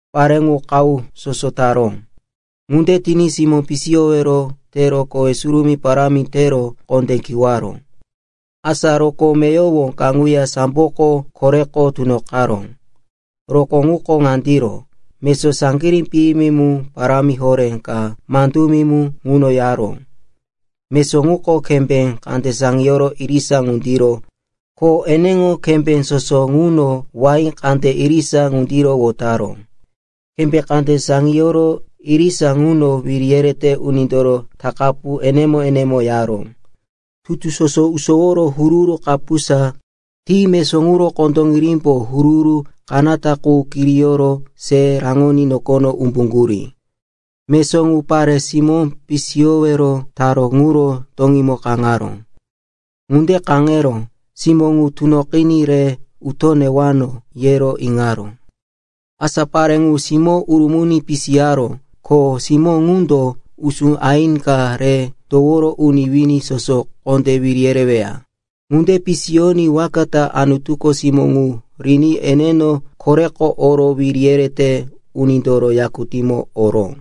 Pare ŋu qahu soso taró. Ŋunde tiní simó pisiyowero teroqo kowe surumí parámi tero kondé kiwaró. Asa rokó meyowo kaŋuya samboko koreko tunoqaró. Rokó ŋuko ŋandiro. Mesó saŋgirí piyimi mu parámi horé ka mandumi mu ŋuno yaró. Mesó ŋuko kembé kande saŋiyoro irisa ŋundiro ko eneŋo kembé soso ŋuno wahí kande irisa ŋundiro wotaró. Kembé kande saŋiyoro irisa ŋuno wiri yerete unindoro takapu enemo-enemo yaró. Tutu soso usoworo huru-huru kapusa ti mesó ŋuro kondoŋirimbo huru-huru kanata qu kiriyoro se raŋoní nokono umbuŋgurí. Mesó ŋu pare simó pisiyowero taró ŋuro toŋímo kaŋaró. Ŋunde kaŋero, simó ŋu tunoqiní re uto newano, yero iŋaró. Asa pare ŋu simó urumuni pisiyaró ko simó ŋundo usú aini ka re toworo uni wini soso kondé wiri yereweya. Ŋunde pisiyoní waka ta Anutuko simó ŋu riní eneno koreko oro wiri yerete unindoro yakutíŋomo oró.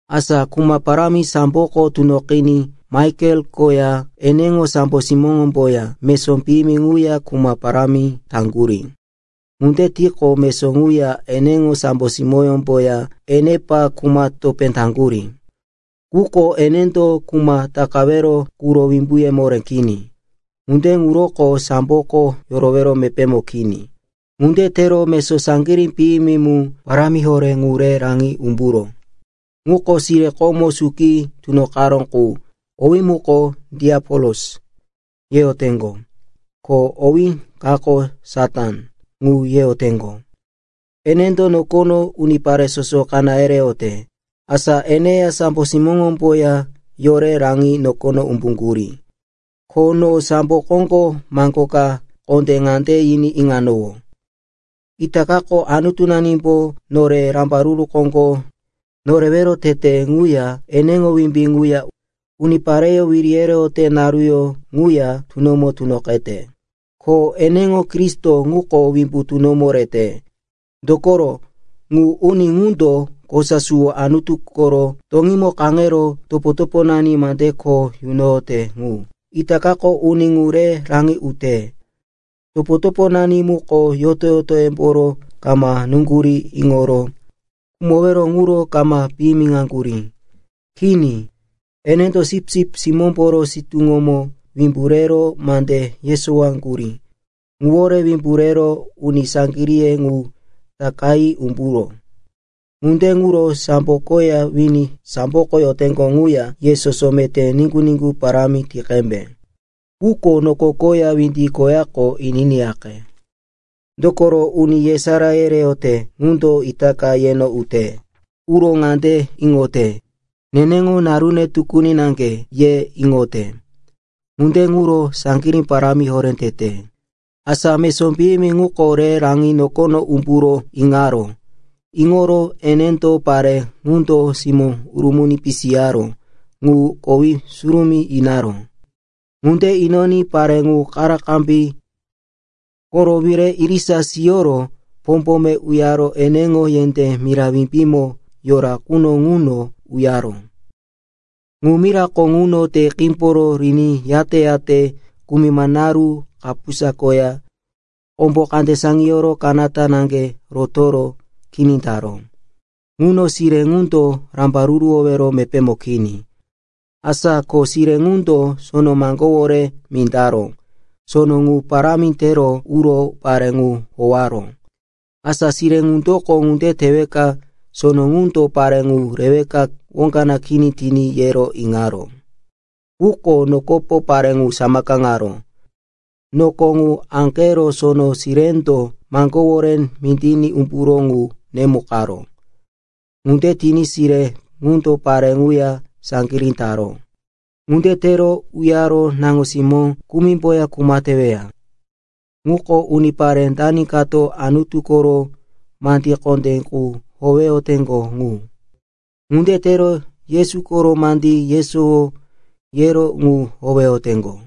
Asa kuma parámi samboko tunoqiní Maikel koya eneŋo sambo simóŋomboya mesó piyimi ŋuya kuma parámi taŋgurí. Ŋunde tiqo, mesó ŋuya eneŋo sambo simóŋomboya enepa kuma topé taŋgurí. Quko enendo kuma takawero quro wimbuye moré kini. Ŋunde ŋuroko samboko yorowero mepémo kini. Ŋunde tero mesó saŋgirí piyimi mu parámi horé ŋu re raŋi umburó. Ŋuko sire komo suki tunoqaró ŋu, owí muko, “Diapolos,” yeyoteŋgo, ko owí kako, “Satan,” ŋu yeyoteŋgo. Enendo nokono unipare soso kaná yereyote. Asa eneya sambo simóŋomboya yore raŋi nokono umbuŋgurí. Ko no sambo koŋgo maŋgo ka kondé ŋande yiní iŋanowó, “Itakako Anutunanimbo nore rambaruru koŋgo norewero tete ŋuya eneŋo wimbí ŋuya unipareyó wiri yereyote naruyó ŋuya tunomo tunoqete, ko eneŋo Kristo ŋuko wimbu tunomo rete. Dokoro, ŋu uni ŋundo kosa suwo Anutu koro toŋímo kaŋero topo-toponani mande kho yunoyote ŋu, itakako uni ŋu re raŋi ute. Topo-toponani muko yoto-yotoyemboro kama nuŋgurí iŋoro khumowero ŋuro kama piyimiŋaŋgurí. Kini, enendo Sipsip Simómboro sitúŋomo wimbu rero mande yesowaŋgurí ŋuwore wimbu rero uni saŋgiríye ŋu takayi umburó. Ŋunde ŋuro sambo koya wini samboko yoteŋgo ŋuya, ye soso meté niŋgu-niŋgu parámi ti qembe. Quko noko koya windi koyako, ininiyaqe. Dokoro uni yesará yereyote ŋundo itaka yeno ute. Uro ŋande iŋote, neneŋo narune tukuni naŋge, ye iŋote. Ŋunde ŋuro saŋgirí parámi horé tete.” Asa mesó piyimi ŋuko re raŋi nokono umburo iŋaró. Iŋoro enendo pare ŋundo simó urumuni pisiyaró ŋu kowe surumí inaró. Ŋunde inoní pare ŋu karakarambí koro wire irisa siyoro pombome uyaro eneŋo yendé mira wimbímo yora quno ŋuno uyaró. Ŋu mirako ŋuno te qímboro riní yate-yate kumima naru kapusa koya kombo kande saŋiyoro kanata naŋge rotoro kini taró. Ŋuno sire ŋundo rambaruruwowero mepémo kini. Asa ko sire ŋundo sono maŋgówore mindaró. Sono ŋu parámi tero uro pare ŋu howaró. Asa sire ŋundoko, ŋunde teweka sono ŋundo pare ŋu reweka woŋga kini tiní, yero iŋaró. Quko nokopo pare ŋu samakaŋaró. Noko ŋu aŋgero sono sirendo maŋgówore mindiní umburó ŋu nemukaró. Ŋunde tiní sire ŋundo pare ŋuya saŋgirí taró. Ŋunde tero uyaro naŋo-simó kumimboya kuma teweya. (Ŋuko unipare dani kato Anutu koro mande kondé qu howeyoteŋgo ŋu. Ŋunde tero Yesu koro mandí yesowo yero ŋu howeyoteŋgo.)